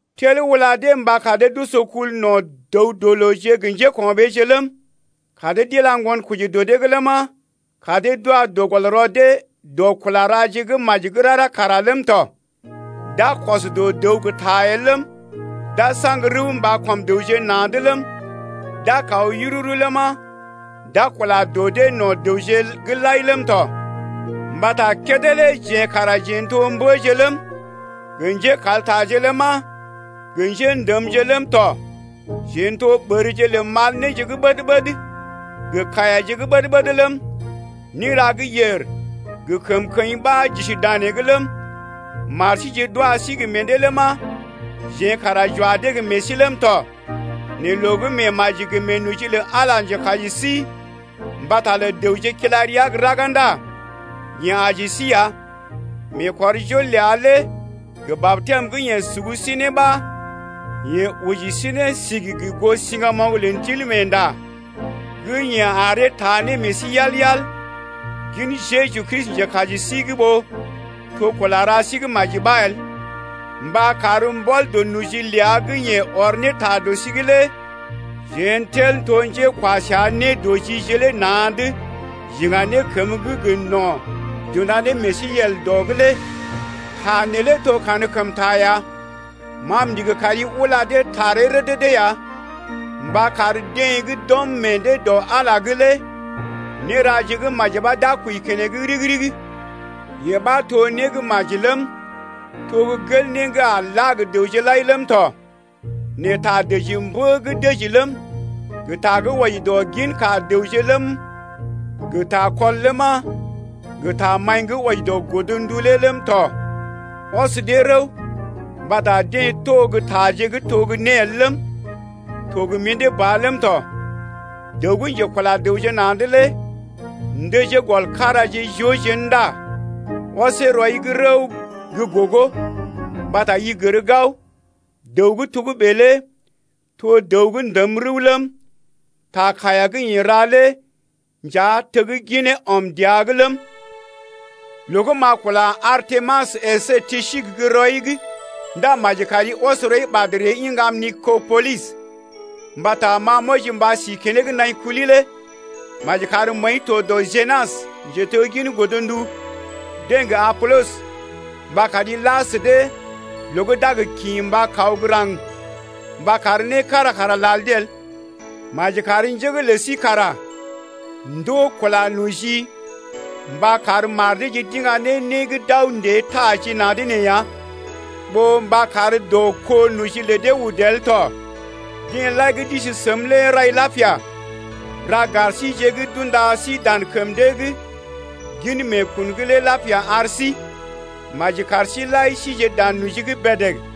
Tel ula dee mba kar dee d’oso kul no̰ dəw-dɔ-looje gə njéko̰ɓeeje’g ləm, kar dee d’ila ŋgonkoji dɔ dee’g ləma, kar dee d’wa dɔ gɔl rɔ dee dɔ kula raje gə́ maji gə́ rara kara ləm tɔ. D’a kɔs dɔ dəw gə́ ta el ləm, d’a saŋg rəw mba kɔm dəwje na̰’d ləm, d’a kaw yururu ləma, d’a kula dɔ dee no̰ dəwje’g lai ləm tɔ. Mbata kédé lé jeḛ kara jeḛ n’to mbəje ləm, gə njékaltaje ləma, gə njḛ́dəmje ləm tɔ. Jeḛ n’to ɓərje lə mal néje gə́ ɓəd-ɓəd gə kaiyaje ɓəd-ɓəd ləm, néra gə́ yèr gə kəmkəḭ ɓa j’isi danee’g ləm, mar síje d’wa sí gə meḛ dee ləma, jeḛ kara j’wa dee gə meḛ sí ləm tɔ. Nɛ loo gə́ meemaji gə meenoji lə Ala njekaji sí mbata lə dəwje kila rəa gə́ raga ndá yeḛ aji sí ya, meekɔrjol ləa lé gə batɛm gə́ yeḛ sugu sí ne ɓa yeḛ oji sí ne sigi gə goo siŋgamoŋ lə Ndilmeenda gə́ yeḛ aree taa ne meḛ sí yal-yal gin Jeju Kristi njekaji sí’g ɓó to kula ra sí gə́ maji ɓa el, mba kar mbɔl dɔ noji ləa gə́ yeḛ ɔr ne ta dɔ sí’g lé jeḛ n’tel to ne njékwa səa nédɔjije lé na̰’d j’iŋga ne kəmə gə́ gə no̰ gə́ j’unda ne meḛ sí yel dɔ’g lé. Ta neelé to kankəmta ya. Ma m’ndigi kari ula dee taree rədədə ya mba kar deḛ gə́ d’ɔm meḛ dee dɔ Ala’g lé néraje gə́ maji ɓa d’a kwəi keneŋ ɗigi-ɗigi. Yee ɓa to né gə́ maji ləm, to gə́ gel né gə́ a la gə dəwje lai ləm tɔ. Nɛ ta dəji mbə gə́ dəji ləm, gə ta gə́ wɔji dɔ ginka dəwje ləm, gə takɔl ləma, gə tamaḭ gə́ wɔji dɔ godndu lé ləm tɔ, ɔs dee rəw, mbata dee to gə́ taje gə́ to gə́ né el ləm, to gə mḭdé ba ləm tɔ. Dəw gə́ njekula dəwje na̰’d lé ndəjee gɔl karaje joo jén ndá ɔsee rəw rɔi’g gə́ gogo, mbata i gər gao, dəw gə́ togə́bè lé to dəw gə́ ndəm rəw ləm, ta kaiya gə́ yeḛ ra lé nja tegginee ɔm dəa’g ləm tɔ. Loo gə́ m’a kula Artemas əsé Tisik gə́ rɔi’g ndá maji kari ɔs rɔi ɓad ree iŋgam Nikopolis. Mbata ma m’wɔji mba si keneŋ naḭ kuli lé. Maji kar məəi to dɔ Jénas, njeteggin godndu deḛ gə Apolɔs mba kari la sə dee loo gə́ d’a gə kḭ mba kaw raŋg mba kar né kára kara lal dee el. Maji kar njé’g lə sí kara ndoo kula noji mba kar mar deeje d’iŋga ne né gə́ d’aw ndée taajina̰’d nee ya, ɓó mba kar dɔ kó noji lə dee udu el tɔ. Deḛ lai gə́ d’isi səm lé rai lapia. Ra gar síje gə́ d’unda sí dan kəm dee gin meekun’g lé lapia ar sí. Maji kar sí-seḭ lai sije dan noji’g bèdèg.